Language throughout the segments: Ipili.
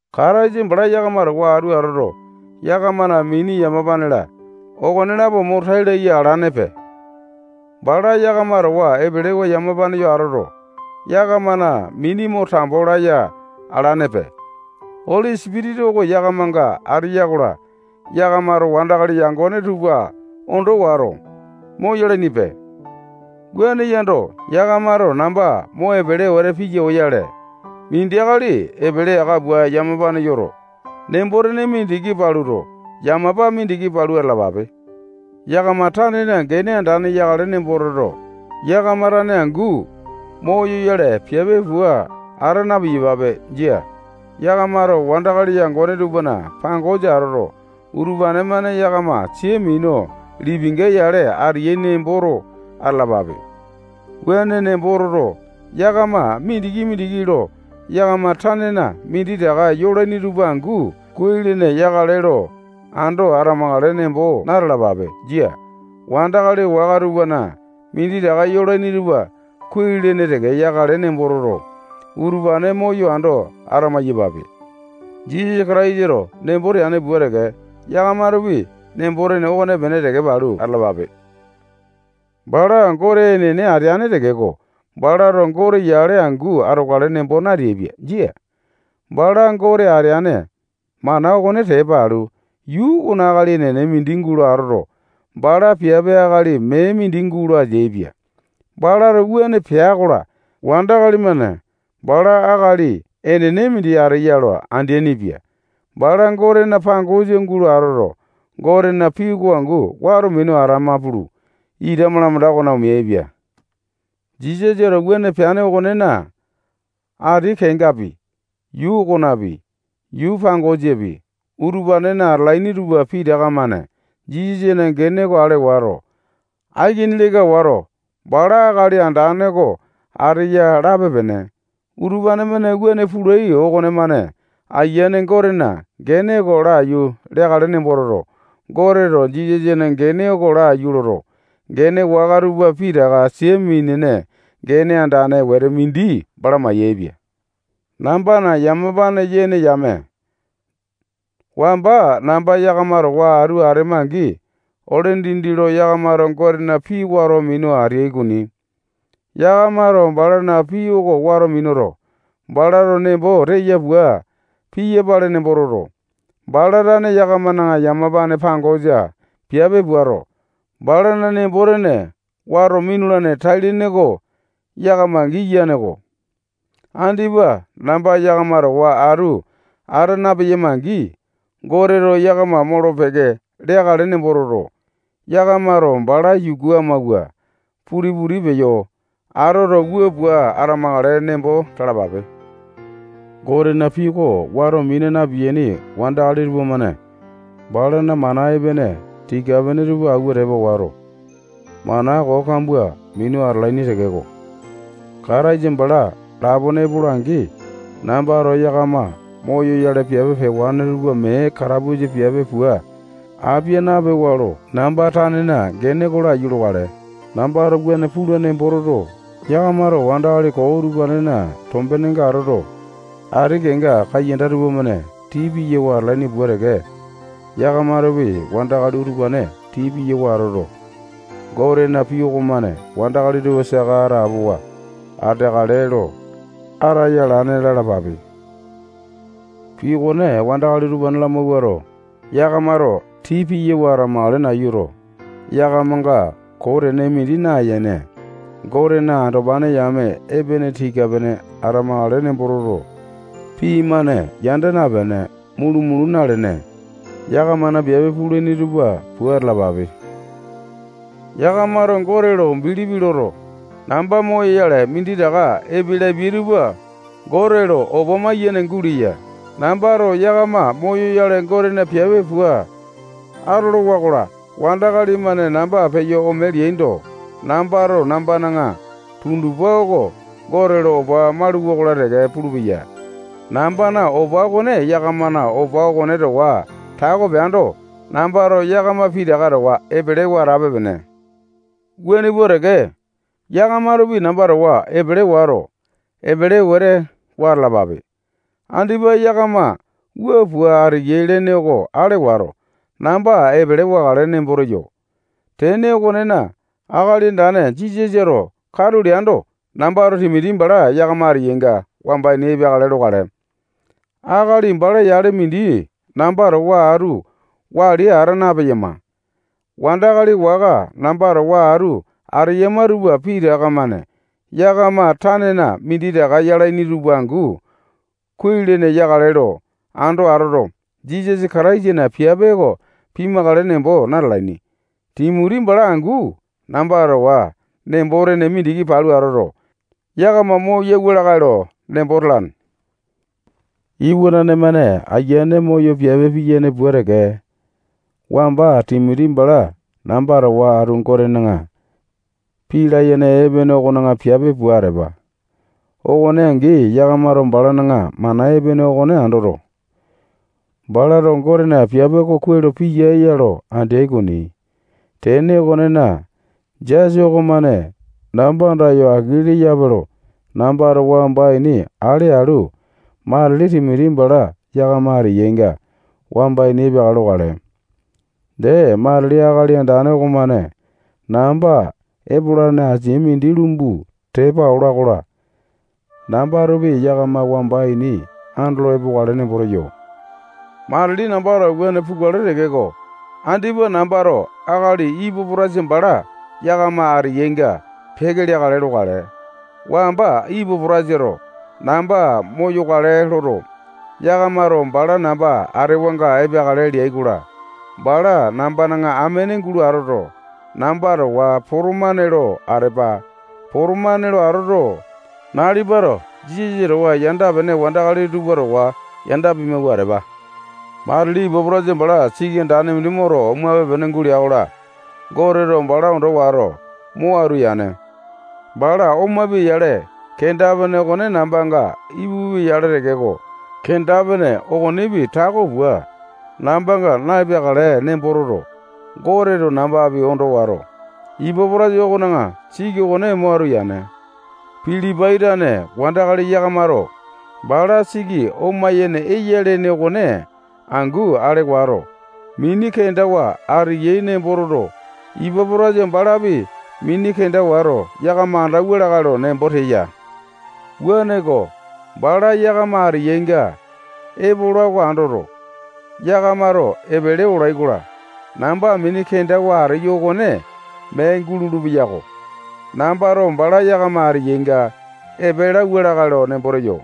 Kataisa bala yakama towa atu atoto, yakamana mini, yamapa-la, okonelapo mo tai laya alanepe. Bala yakama towa epelewa yamapane yo atoto, yakamana mini mo tambo laya alanepe. Oli Sipitisa oko yakamanga ateya-kola, yakamato wandakali yangone tupa ondo wato, moyalainipe. Wuane yando, yakamato namba mo epele wete piya oyale, mindi akali epele aka pua yamapane yoto, nembo-tene mindiki paluto, yamapa mindiki palu atalapape. Yakama tanena gene andane yakale nembo toto, yakama tane angu moyoyale piape pua ata na-piyapape. Jia. Yakamato wandakali yangone tupana pangosa atoto, utupane-mane yakama sia minu lipinga yale ateyai nemboto atalapape. Wuane nembo toto, yakama mindiki-mindiki lo yakama tanena minditaka yolaini tupa angu kuai-lene yakale lo ando atamakale nembo na-talapape. Jia. Wandakali waka tupana minditaka yolaini tupa kuai-lene teke yakale nembo toto, utupane moyo ando ata maiyapape. Jisasa Kataisato nembo teane pua teke, yakamatopi nembo-tene okonepene teke palu atalapape. Bala Gote enene ateane tekeko, balato Gote yale angu atokale nembo nateaipia. Jia. Bala Gote ateane mana okone tepa alu, yuu okona akali enene mindi gulo atoto, bala piape akali mee mindi gulo ateaipia. Balato wuane pea-kola, wandakali-mane bala akali enene mindi ateya lo andeaini-pia. Bala Gotena pangosa gulo atoto, Gotena pii oko angu wato minu atama pulu, ita malamanda okona omeaipia. Jisasato wuane peane okonena, ati kengapi, yuu okonapi, yuu pangosapi, utupanena atalaini tupa pitaka-mane Jisasana gene oko ale wato, aikini leka wato, bala Akali Andane oko ateya lape-pene. Utupane-mane wuane pulai okonemane, Ayiane Gotena gene oko laiyu leakale nembo toto, Goteto Jisasana gene oko laiyu loto, gene waka tupa pitaka sia minene gene andane wete mindi bala mayaepia. Nambana yamapane yene yame, wamba namba yakama towa atu atema-angi, ole dindi lo yakamato Gotena pii wato minu ateai okoni. Yakamato balana pii oko wato minuto, balato nembo teya pua piyapale nembo toto, bala tane yakamana yamapane pangosa piape puato, balana nembo-tene wato minulane tai-lene oko yakama giyane-ko. Andipa namba yakama towa atu ata napeyama-angi, Goteto yakama molo-peke leakale nembo toto, yakamato bala yuku amawua puti-puti peyo atoto, wua pua atamakale nembo talapape. Gotena pii oko wato mina na-piyaini wandakali tupamane balana mana epene tika-pene tupa awua tepa wato, mana koo kambua minu atalaini tekeko, Kataisa bala lapone epola-angi, nambato yakama moyoyale piape pewane tupa mee katapusa piape pua apia napewa lo namba tanena gene oko laiyu lokale. Nambato wuane pula nembo toto, yakamato wandakali koo utupanena tombenenga atoto, ati kenga kaiyanda tupamane tii piyawa atalaini pua teke, yakamatopi wandakali utupane tii piyawa atoto, Gotena pii okomane wandakali tupa saka atapowa ateakale lo ataya alane lalapape. Pii okone wandakali utupane lamawuato, yakamato tii piyawa atamakale nayuto, yakamanga koo tene mindi nayene, Gotena andopane yame epene tika-pene atamakale nembo toto, pii-mane yanda napene, mulu-mulu nalene, yakamana piape pulaini tupa pua atalapape. Yakamato Gote lo bilipi loto, namba moyoyale minditaka epe lapiai tupa Gote lo opa maiyene guleya. Nambato yakama moyoyale Gotena piape pua atolowa-kola, wandakali-mane namba peyo ome leaindo, nambato nambana tundupa oko Gote lo opa mauluwa-kola teke pulupeya. Nambana opa okone yakamana opa okone towa tako peando, nambato yakama pitaka towa epelewa atape-pene. Wuane pua teke, yakamatopi namba towa epele wato, epele wete wa atalapape. Andipa yakama wua pua ateyai lene oko ale wato, namba epele wakale nembo teyo. Tene okonena, Akali Andane Jisasato katu leando, nambato Timoti bala yakama ateyainga wamba ini epeakale lokale. Akali bala yale mindi namba towa atu wali ata napeyama. Wandakali waka namba towa atu ateyama tupa pitaka-mane yakama tanena minditaka yalaini tupa angu kuai-lene yakale lo ando atoto, Jisasa Kataisana piape oko pimakale nembo natalaini. Timoti bala angu namba towa nembo-tene mindiki palu atoto, yakama moyauwa lakae lo nembo talane. Iwanane-mane ayiane moyo piape piyane pua teke, wamba Timoti bala namba towa atu Gotena pii layene epene okona piape pua atepa. Okone angi, yakamato balana mana epene okone andoto, balato Gotena piape oko kuai lo piyae-ya lo andeai okoni. Tene okonena, jasa okomane namba andayo aki leyape lo nambato wamba ini ale alu, matili Timoti bala yakama ateyainga wamba ini epeakale lokale. Dee, matili Akali Andane okomane namba epolane asia mindi lumbu tepa ola-kola, nambatopi yakama wamba ini andolo epokale nembo teyo. Matili nambato wuane pukale tekeko, andipa nambato akali Ipapo-taitasa bala yakama ateyainga peke leakale lokale. Wamba Ipapo-taitasato namba moyakale loto, yakamato bala namba atewanga epeakale leai-kola, bala nambana amene gulo atoto, namba towa potomane lo atepa. Potomane lo atoto, nalipato Jisasa towa yanda-pene wandakali tupa towa yanda pimawua atepa. Matili Ipapo-taitasa bala siki andane mindi moto, omape-pene gulea-kola, Goteto bala ando wato, mo atu yane. Bala omapia-yale, kenda-pene okone nambanga ipupia-yale tekeko, kenda-pene okonepi tako pua nambanga na-epeakale nembo toto, Goteto nambapi ondo wato, Ipapo-taitasa okona siki okone mo atu yane. Pilipai tane wandakali yakamato bala siki oma-yene eya lene okone angu ale wato, mini kendawa ateyai nembo toto, Ipapo-taitasa balapi mini kenda wato, yakama andauwa lakae lo nembo teya. Wuaneko, bala yakama ateyainga epola oko andoto, yakamato epele olai-kola, namba mini kendawa ateyo okone mee gulolo-peyako. Nambato bala yakama ateyainga epe lauwa lakae lo nembo teyo.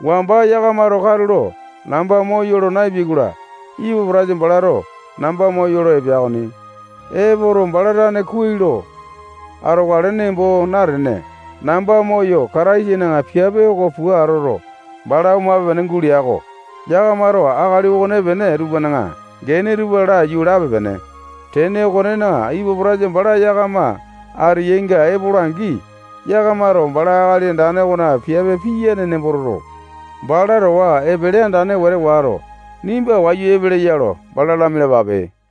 Wamba yakamato katulo namba moyolo naepeai-kola, Ipapo-taitasa balato namba moyolo epea okoni. Epoto, bala tane kuai lo atokale nembo natene, namba moyo Kataisana piape oko pua atoto, bala omape-pene gulea-ko. Yakamato akali okonepene tupana gene tupa laiyu lape-pene. Tene okonena, Ipapo-taitasa bala yakama ateyainga epola-angi, yakamato bala Akali Andane okona piape piyane nembo toto, bala towa epele andane wete wato, nimba wayu epeleya lo bala lamialapape.